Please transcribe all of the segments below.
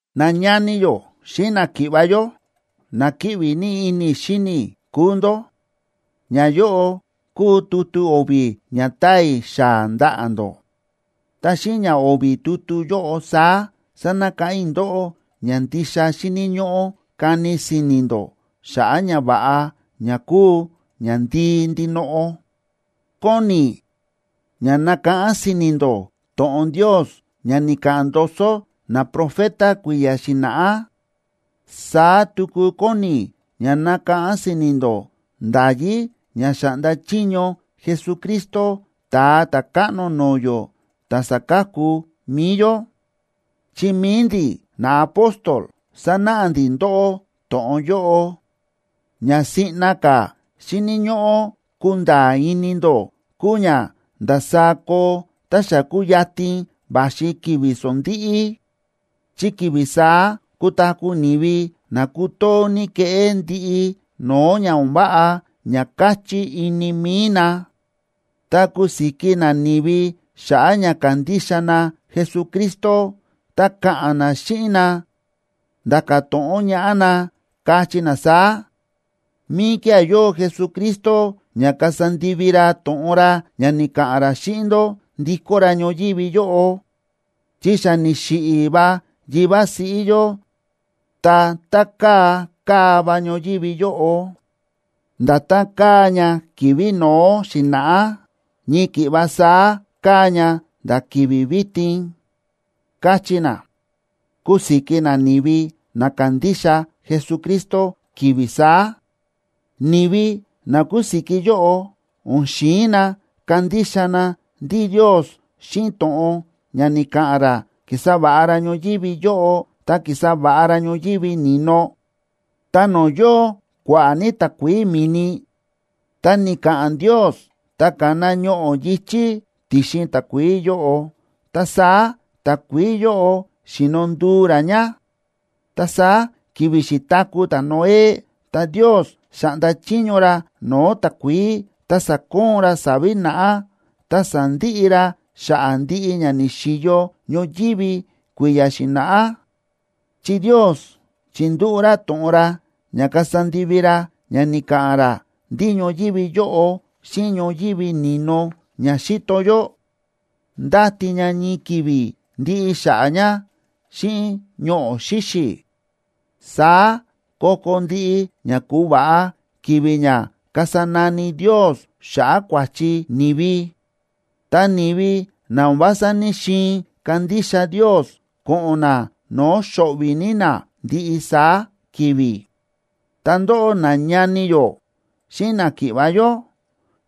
Nañani yó xíꞌin náki̱ꞌva̱ yó, na kíꞌvi ní ini i̱ xíni i̱ kúu ndó, ñayóꞌo kúu tutu o̱vi̱ ña táa i̱ xaa̱ ndaꞌa̱ ndó. Ta xíꞌin ña o̱vi̱ tutu yóꞌo saá sánakáꞌán i̱ ndóꞌó ña ndixa xíni̱ ñóꞌó kani si̱ni̱ ndó xa̱ꞌa̱ ñava̱ꞌa ña kúu ñandii ndinoꞌo. Kóni i̱ ña nakáꞌán si̱ni̱ ndó to̱ꞌon Ndios ña ni̱ka̱ꞌa̱n ndoso naprofeta kui̱ya̱ xi̱na̱ꞌá. Saá tuku kóni i̱ ña nakáꞌán si̱ni̱ ndó nda̱yí ña xa̱ꞌnda chiño Jesucristo Ta̱a Ta̱káꞌno no̱o̱ yó ta̱ sa̱ka̱ku mi̱i yó, chi mi̱i ndi̱ naapóstol sa̱náꞌa ndi̱ ndóꞌó to̱ꞌon yóꞌo. Ña siꞌna ka̱ xíni̱ ñóꞌó kunda̱a̱ ini ndó kúu ña ndasaá koo tá xa kuyatin va̱xi ki̱vi̱ sondíꞌí. Chi ki̱vi̱ saá kutaku̱ ni̱vi na kutoo ní keꞌé ndiꞌi no̱o̱ ña o̱n váꞌa ña káchí ini mi̱i na, ta kusiki na ni̱vi xa̱ꞌa̱ ña kándixa na Jesucristo, ta ka̱ꞌa̱n na xíꞌin na, nda̱ka̱ to̱ꞌon ñaꞌá na, kachí na saá: “¿Míkía̱ yóo Jesucristo ña kasa ndivi ra to̱ꞌon ra ña ni̱ka̱ꞌa̱n ra xíꞌin ndó, ndikó ra ñoyívi yóꞌo? Chi xa ni̱xiꞌi̱ va yivá siꞌí yó, ta tá káa ka̱ va ñoyívi yóꞌo, nda̱tán káa ña ki̱vi̱ no̱ó xi̱na̱ꞌá, ñii ki̱ꞌva saá káa ña nda̱ ki̱vi̱ vitin”, kachí na, kusiki na ni̱vi na kándixa Jesucristo ki̱vi̱ saá. Ni̱vi na kusiki yóꞌo o̱n xi̱in na kandixa na ndí Ndios xíꞌin to̱ꞌon ña ni̱ka̱ꞌa̱n ra ki̱sa va̱ꞌa ra ñoyívi yóꞌo ta ki̱sa va̱ꞌa ra ñoyívi ni̱no. Ta no̱o̱ yóo kua̱ꞌa̱ ní takuií mi̱ni, ta ni̱ka̱ꞌa̱n Ndios ta ka̱na ñoꞌo̱ yi̱chí ti̱xin takuií yóꞌo, ta saá takuií yóꞌo xíno nduu rá ña. Ta saá ki̱vi̱ xi̱taku̱ ta̱Noé, ta Ndios xa̱ꞌnda chiño ra no̱o̱ takuií ta sa̱koon ra sa̱vi̱ naꞌá, ta sa̱ndiꞌi ra xa̱ꞌa̱ ndiꞌi ña ni̱xi̱yo ñoyívi kui̱ya̱ xi̱na̱ꞌá. Chi Ndios chi̱ndúꞌu̱ ra to̱ꞌon ra ña kasa ndivi ra ña ni̱ka̱ꞌa̱n ra ndí ñoyívi yóꞌo xíꞌin ñoyívi ni̱no ña xíto yó, ndáti ña ñii ki̱vi̱ ndiꞌi xa̱ꞌa̱ ña xíꞌin ñoꞌo̱ xíxi̱. Saá ko̱ko̱ ndiꞌi ña ku̱va̱ꞌa ki̱vi̱ ña kasa nani Ndios xa̱ꞌa̱ kua̱chi ni̱vi, ta ni̱vi na o̱n vása ní‑xiin kandixa Ndios ko̱ꞌo̱n na no̱o̱ xo̱ꞌvi̱ ní na ndiꞌi saá ki̱vi̱. Ta ndóꞌó, nañani yó xíꞌin náki̱ꞌva̱ yó,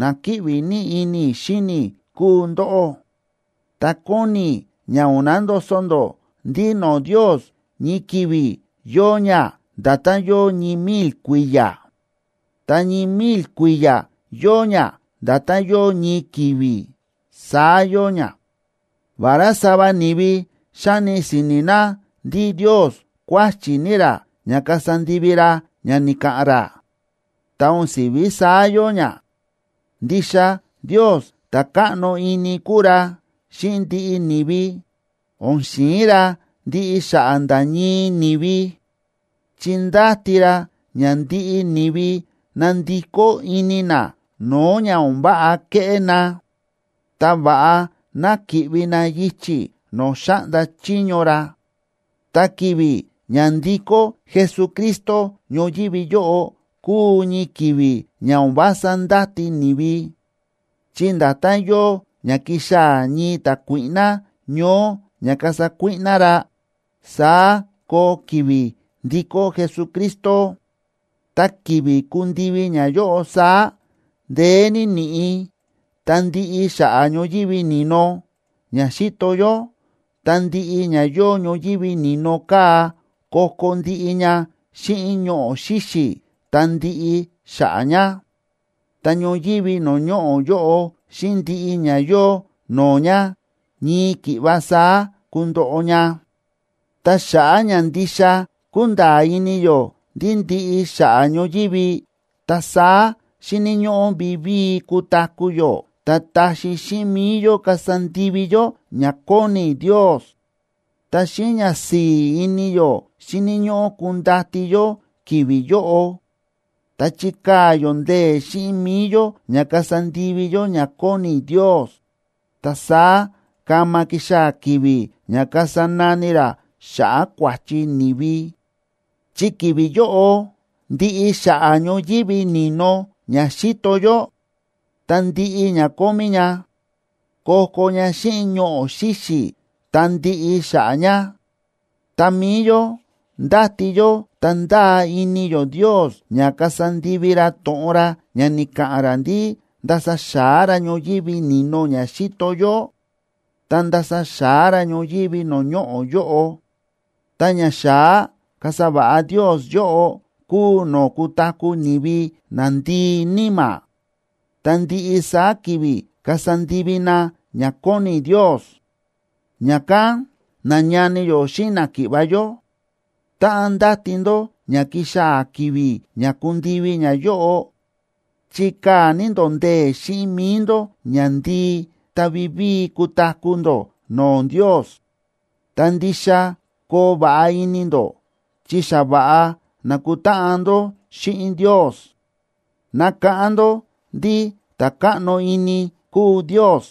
na kíꞌvi ní ini i̱ xíni i̱ kúu ndóꞌó; ta kóni i̱ ña o̱n nandoso ndó ndí no̱o̱ Ndios ñii ki̱vi̱ yóo ña nda̱tán yóo ñii mil kui̱ya̱, ta ñii mil kui̱ya̱ yóo ña nda̱tán yóo ñii ki̱vi̱, saá yóo ña. Vará sava ni̱vi xáni si̱ni̱ na ndí Ndios kuáchi̱ ní ra ña kasa ndivi ra ña ni̱ka̱ꞌa̱n ra, ta o̱n si̱ví saá yóo ña. Ndixa Ndios ta̱ káꞌno ini kúu ra xíꞌin ndiꞌi ni̱vi, o̱n xi̱in ra ndiꞌi xa̱ꞌa̱ nda̱ ñii ni̱vi; chi ndáti ra ña ndiꞌi ni̱vi ná ndikó ini na no̱o̱ ña o̱n váꞌa kéꞌé na, ta va̱ꞌa ná ki̱ꞌvi na yichi̱ no̱o̱ xáꞌnda chiño ra. Ta ki̱vi̱ ña ndikó Jesucristo ñoyívi yóꞌo kuu ñii ki̱vi̱ ña o̱n vása ndáti ni̱vi, chi nda̱tán yóo ña kixaa̱ ñii ta̱kuíꞌná ñoó ña kasa kuíꞌná ra, saá koo ki̱vi̱ ndikó Jesucristo. Ta ki̱vi̱ kundivi ñayóꞌo saá, ndeé ní ni̱ꞌi̱ ta ndiꞌi xa̱ꞌa̱ ñoyívi ni̱no ña xíto yó, ta ndiꞌi ña yóo ñoyívi ni̱no kaa̱ ko̱ko̱ ndiꞌi ña xíꞌin ñoꞌo̱ xíxi̱ ta ndiꞌi xa̱ꞌa̱ ña, ta ñoyívi no̱o̱ ñoꞌo̱ yóꞌo xíꞌin ndiꞌi ña yóo no̱o̱ ña ñii ki̱ꞌva saá kundoꞌo ña. Ta xa̱ꞌa̱ ña ndixa kúnda̱a̱ ini yó ndí ndiꞌi xa̱ꞌa̱ ñoyívi, ta saá xíni̱ ñóꞌó vivíi kutaku̱ yó ta taxi xíꞌin mi̱i yó kasa ndivi yó ña kóni Ndios. Ta xíꞌin ñasi̱i̱ ini yó xíni̱ ñóꞌó kundati yó ki̱vi̱ yóꞌo, ta chikaa̱ yó ndee̱ xíꞌin mi̱i yó ña kasa ndivi yó ña kóni Ndios, ta saá kama kixaa̱ ki̱vi̱ ña kasa nani ra xa̱ꞌa̱ kua̱chi ni̱vi. Chi ki̱vi̱ yóꞌo ndiꞌi xa̱ꞌa̱ ñoyívi ni̱no ña xíto yó ta ndiꞌi ña kómí ña, ko̱ko̱ ña xíꞌin ñoꞌo̱ xíxi̱ ta ndiꞌi xa̱ꞌa̱ ña. Ta mi̱i yó ndáti yó ta ndáa ini yó Ndios ña kasa ndivi ra to̱ꞌon ra ña ni̱ka̱ꞌa̱n ra ndí ndasa xa̱á ra ñoyívi ni̱no ña xíto yó, ta ndasa xa̱á ra ñoyívi no̱o̱ ñoꞌo̱ yóꞌo. Ta ñaxa̱á kasa va̱ꞌa Ndios yóꞌo kúu no̱o̱ kutaku̱ ni̱vi na ndii níma̱, ta ndiꞌi saá ki̱vi̱ kasa ndivi na ña kóni Ndios. Ña̱kán, nañani yó xíꞌin náki̱ꞌva̱ yó, táꞌan ndáti ndó ña kixaa̱ ki̱vi̱ ña kundivi ñayóꞌo, chikaa̱ ní ndó ndee̱ xíꞌin mi̱i ndó ña ndii ta vivíi kutaku̱ ndó no̱o̱ Ndios, ta ndixa koo va̱ꞌa ini ndó chi xa va̱ꞌa nákutáꞌan ndó xíꞌin Ndios. Nakáꞌán ndó ndí ta̱ káꞌno ini kúu Ndios,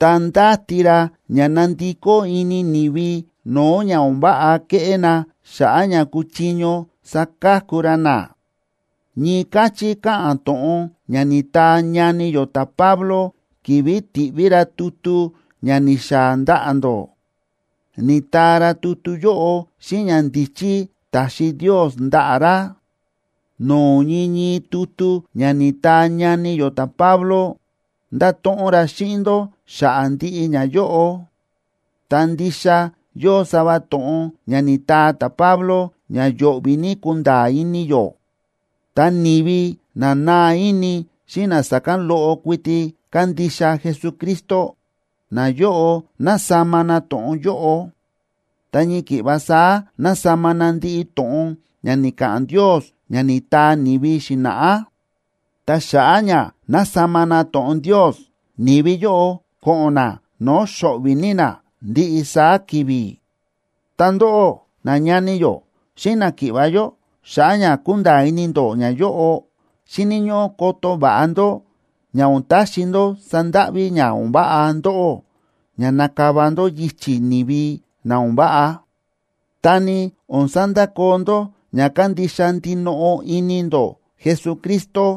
ta ndáti ra ña ná ndikó ini ni̱vi no̱o̱ ña o̱n váꞌa kéꞌé na xa̱ꞌa̱ ña kuchiño saka̱ku ra na. Ñii káchí káꞌa̱n to̱ꞌon ña ni̱taa ñani yó ta̱Pablo ki̱vi̱ ti̱ꞌví ra tutu ña ni̱xaa̱ ndaꞌa̱ ndó; ni̱taa ra tutu yóꞌo xíꞌin ñandíchí ta̱xi Ndios ndaꞌa̱ ra. No̱o̱ ñii ñii tutu ña ni̱taa ñani yó ta̱Pablo nda̱to̱ꞌon ra xíꞌin ndó xa̱ꞌa̱ ndiꞌi ñayóꞌo, ta ndixa yóo sava to̱ꞌon ña ni̱taa ta̱Pablo ña yo̱ꞌvi̱ ní kunda̱a̱ ini yó. Ta ni̱vi na naa ini xíꞌin na sa̱kán loꞌo kuiti kándixa Jesucristo, nayóꞌo násama na to̱ꞌon yóꞌo, ta ñii ki̱ꞌva saá násama na ndiꞌi to̱ꞌon ña ni̱ka̱ꞌa̱n Ndios ña ni̱taa ni̱vi xi̱na̱ꞌá. Ta xa̱ꞌa̱ ña násama na to̱ꞌon Ndios, ni̱vi yóꞌo ko̱ꞌo̱n na no̱o̱ xo̱ꞌvi̱ ní na ndiꞌi saá ki̱vi̱. Ta ndóꞌó, nañani yó xíꞌin náki̱ꞌva̱ yó, xa̱ꞌa̱ ña kúnda̱a̱ ini ndó ñayóꞌo, xíni̱ ñóꞌó koto va̱ꞌa ndó ña o̱n taxi ndó sandáꞌví ña o̱n váꞌa ndóꞌó ña nakava ndó yichi̱ ni̱vi na o̱n váꞌa, ta ni o̱n sandakoo ndó ña kándixa ndinoꞌo ini ndó Jesucristo.